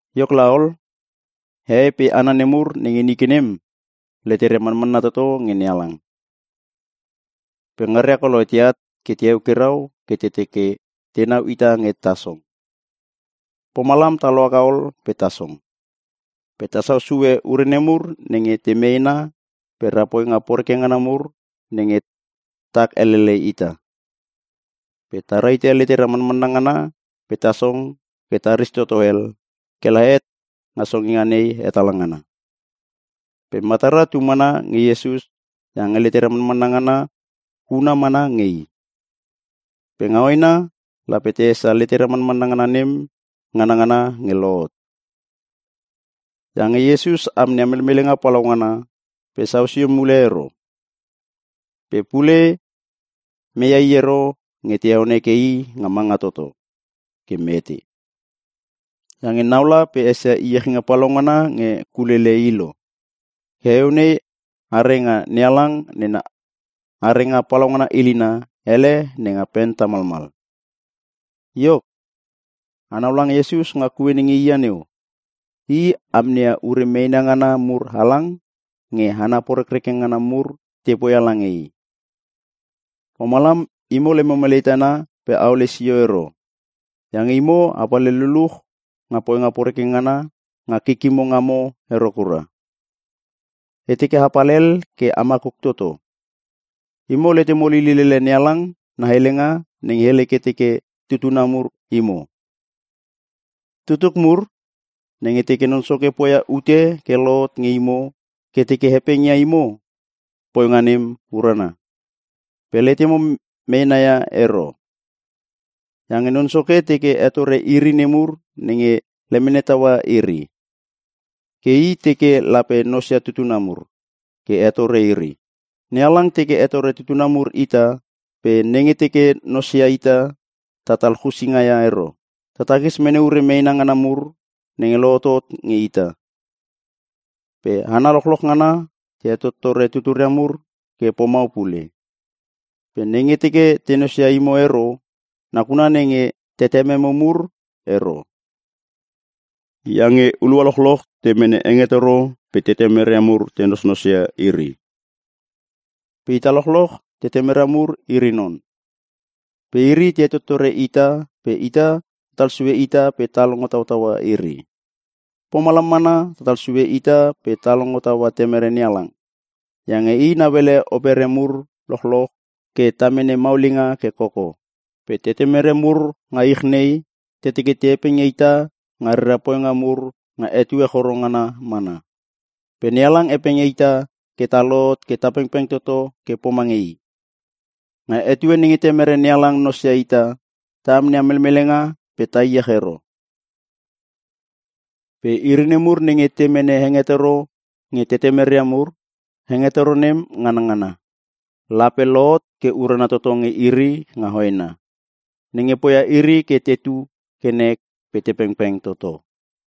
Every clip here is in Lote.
Iok laol, hehei pe hana nemur nenge nike nem, leteria manmanna toto nge NeHalang. Pe ngaria koloi teat ke te eukirau ke te teke tenau ita nge ta song. Pomalam ta lohaka ol pe ta song. Pe ta sausue ure nemur nenge te meena pe ra poinga poreke ngana mur nenge tak elele ita. Pe ta rahite letera manmanna ngana pe ta song ke ta ristoto hel, ke la het nga songinga nei hetala ngana. Pe matara tu mana nge Iesus iange letera manmanna ngana huna mana nge i. Pe nga hoena, lape ta esia letera manmanna ngana nem nganngana nge lohot. Iange Iesus amneia melmelenga palaungana pe sau sio mule ero. Pe pule meia I ero nge te heon heke I nga manga toto ke mete. Iange naula pe esia iechinga palaungana nge kulele I lo. Ke heueu nei are nga NeHalang nena arenga palaungana ilina ele nenga pen tamalmal. Iok, anau lange Iesus nga kue nenge i ia neu. I amneia ure meena ngana mur halang nge hana porekreke ngana mur te poia lange I. Pomalam imo lemo melei tana pe aole sio ero. Iange imo a palhel luluch nga poinga poreke ngana nga kikimo ngamo ero kura. E teke apal hel ke a makuk toto. Imo letemo lilil ele NeHalang na helenga nenge hele ke teke tutuna mur imo: “Tutuk mur, nenge teke Non Soke poia ute ke lohot nge imo ke teke hepeng ia imo, poinga nem urana, pe letemo meena ia ero. Iange Non Soke teke hetore iri nemur nenge lemene taua iri. Ke I teke lape nosia tutuna mur ke hetore iri.” NeHalang teke hetore tutuna mur ita, pe nenge teke nos ia ita, tatal chusinga ia ero. Ta tatakis mene ure meena ngana mur nenge lohotot nge ita. Pe hana lochloch ngana te hetottore tuturia mur ke pomau pule. Pe nenge teke te nosia imo ero, nakuna nenge tetememo mur ero. Iange hulua lochloch te mene hengetoro pe tetemeria mur te nosnos ia iri. Pe ita lochloch tetemera mur iri non. Pe iri te hetottore ita pe ita tatal sue ita pe ta longo tautaua iri. Pomalam mana tatal sue ita pe ta longo taua temere NeHalang. Iange I nauele opere mur lochloch ke ta mene maulinga ke koko. Pe tetemere mur nga ich nei, te teke te hepeng ia ita nga rera poinga mur nga etue choro ngana mana. Pe NeHalang hepeng ia ita ke ta lohot ke ta pengpeng toto ke pomange I. Nga etue nenge Temere NeHalang nosia ita, ta amneia melmelenga pe ta iech ero. Pe iri nemur nenge te mene hengetoro nge tetemeria mur, hengetoro nem nganangana, lape lohot ke urana toto nge iri nga hoena. Nenge poia iri ke tetu ke nek pe te pengpeng toto.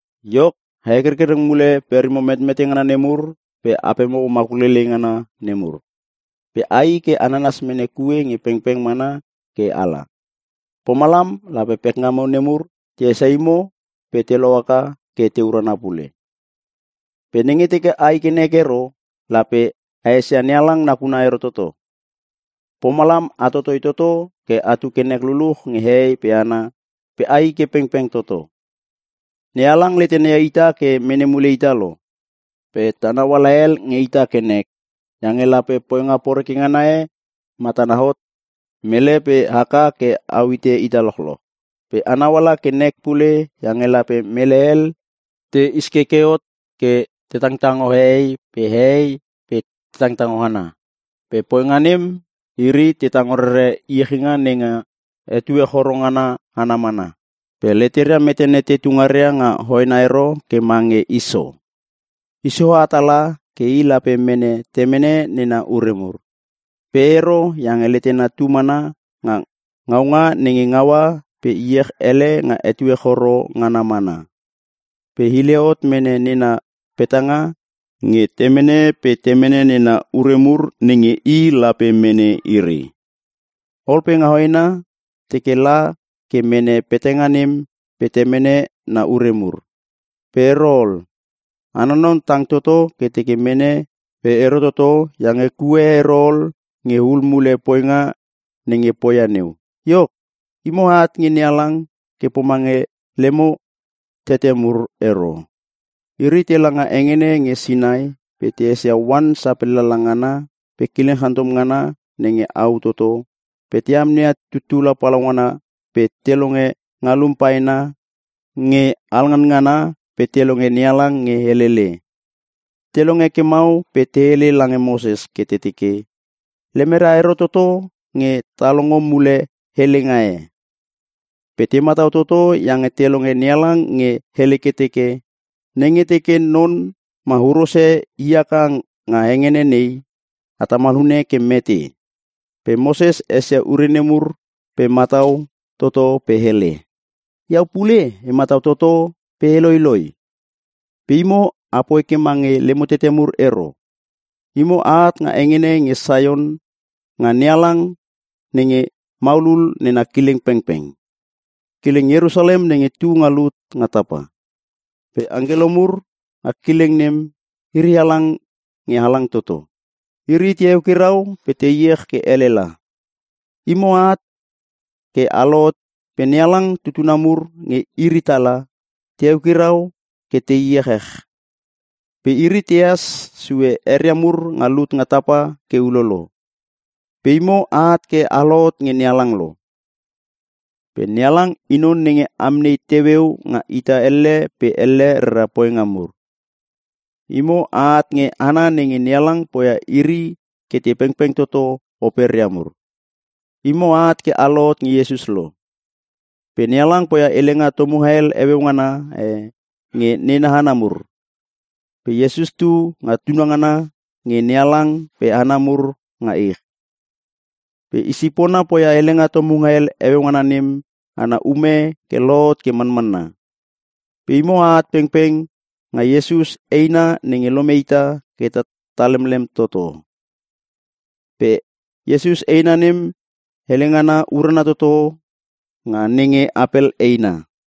Iok, a hekerkereng mule perimo metmete ngana nemur pe apemo makuk leilei ngana nemur. Pe ai ke a nanas mene kue nge pengpeng mana ke ala. Pomalam lape pekngamo nemur te esia imo pe te lohaka ke te urana pule. Pe nenge teke ai ke nek ero, lape a esia NeHalang nakuna ero toto. Pomalam a totoi toto ke atu ke nek luluch nge hehei pe hana, pe ai ke a pengpeng toto. NeHalang letena ia ita ke mene mule ita lo. Pe ta nauala hel nge ita ke nek, iange lape poinga poreke ngana e, matana hot nge mele pe haka ke au hite ita lochloch. Pe a nauala ke nek pule iange lape mele hel te iskeke hot ke te tangtango hehei pe hehei te tangtango hana. Pe poinga nem, iri te tango rere iechinga nenga etue choro ngana ana mana. Pe leteria metene tetu ngaria nga hoena ero ke mange Iso. Iso ha tala ke i lape mene temene nena ure mur. Pe ero iange letena tu mana nga ngaunga nenge ngaua, pe iech ele nga etue choro ngana mana. Pe hile hot mene nena petanga nge temene pe temene na ure mur nenge i lape mene iri. Ol pe nga hoena, teke la ke mene petanga nem pe temene na ure mur. Pe ero ol. Ana non tang toto ke teke mene pe ero toto, iange kue e ero ol nge hul mule poinga nenge poia neu. Iok, imo aat nge NeHalang ke pomange lemo tete mur ero. Iri tela nga hengene nge Sinai pe te esia oan sapellala ngana pe kileng chantom ngana nenge au toto, pe te amneia tuttula palaungana pe te longe ngalum paena nge alnganngana pe te longe NeHalang nge helele. Te longe ke mau pe te hele lange Moses ke te teke, lemeria ero toto nge te longo mule helenga e. Pe te matau toto iange te longe NeHalang nge hele ke teke, “Nenge teke none ma huros e i haka nga hengene nei, a tamal hune ke mete.” Pe Moses esia ure nemur pe matau toto pe hele, “Iau pule e matau toto pe e loiloi.” Pe imo a poi ke mange lemo tete mur ero. Imo aat nga hengene nenge Saion, nga NeHalang nenge maulul nena kileng pengpeng. Kileng Ierusalem nenge tu nga lut nga tapa. Pe angkelo mur nga kileng nem, iri halang nge halang toto. Iri te eukirau pe te iech ke elela. Imo aat ke a lohot pe NeHalang tutuna mur nenge iri tala, te eukirau ke te iechech. Pe iri tehas sue eria mur nga lut nga tapa ke ulolo. Pe imo aat ke a lohot nge NeHalang lo. Pe NeHalang I non nenge amnei teueu nga ita elle pe elle rera poinga mur. Imo aat nge hana nge NeHalang poia iri ke te pengpeng toto operia mur. Imo aat ke a lohot nge Iesus lo. Pe NeHalang poia helenga tomunga hel heueu ngana e, nge nena hana mur. Pe Iesus tu nga tunangana nge NeHalang pe hana mur nga ich. Pe I sipona poia helenga tomunga hel heueu ngana nem ana ume ke lohot ke manmanna. Pe imo aat pengpeng nga Iesus eina nenge lome ita ke ta lemlem toto. Pe Iesus eina nem helengana urana toto nga nenge Apel eina.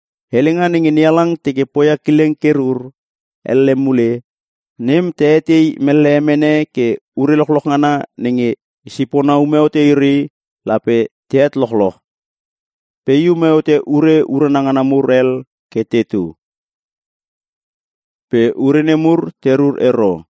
Helenga nenge NeHalang teke poia kileng ke rur “elle mule,” nem ta etei mellehe mene ke ure lochloch ngana nenge I sipona ume hote iri, lape te het lochoch. Pe I ume hote ure urana ngana mur hel ke tetu. Pe ure nemur te rur ero.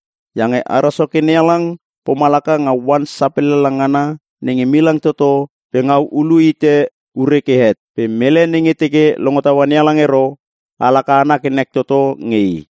Iange ara Soke NeHalang, pomalaka nga oan sapellala ngana nenge milang toto pe ngau ulu hite ure ke het. Pe mele nenge teke longo taua NeHalang ero, alaka ana ke nek toto nge i.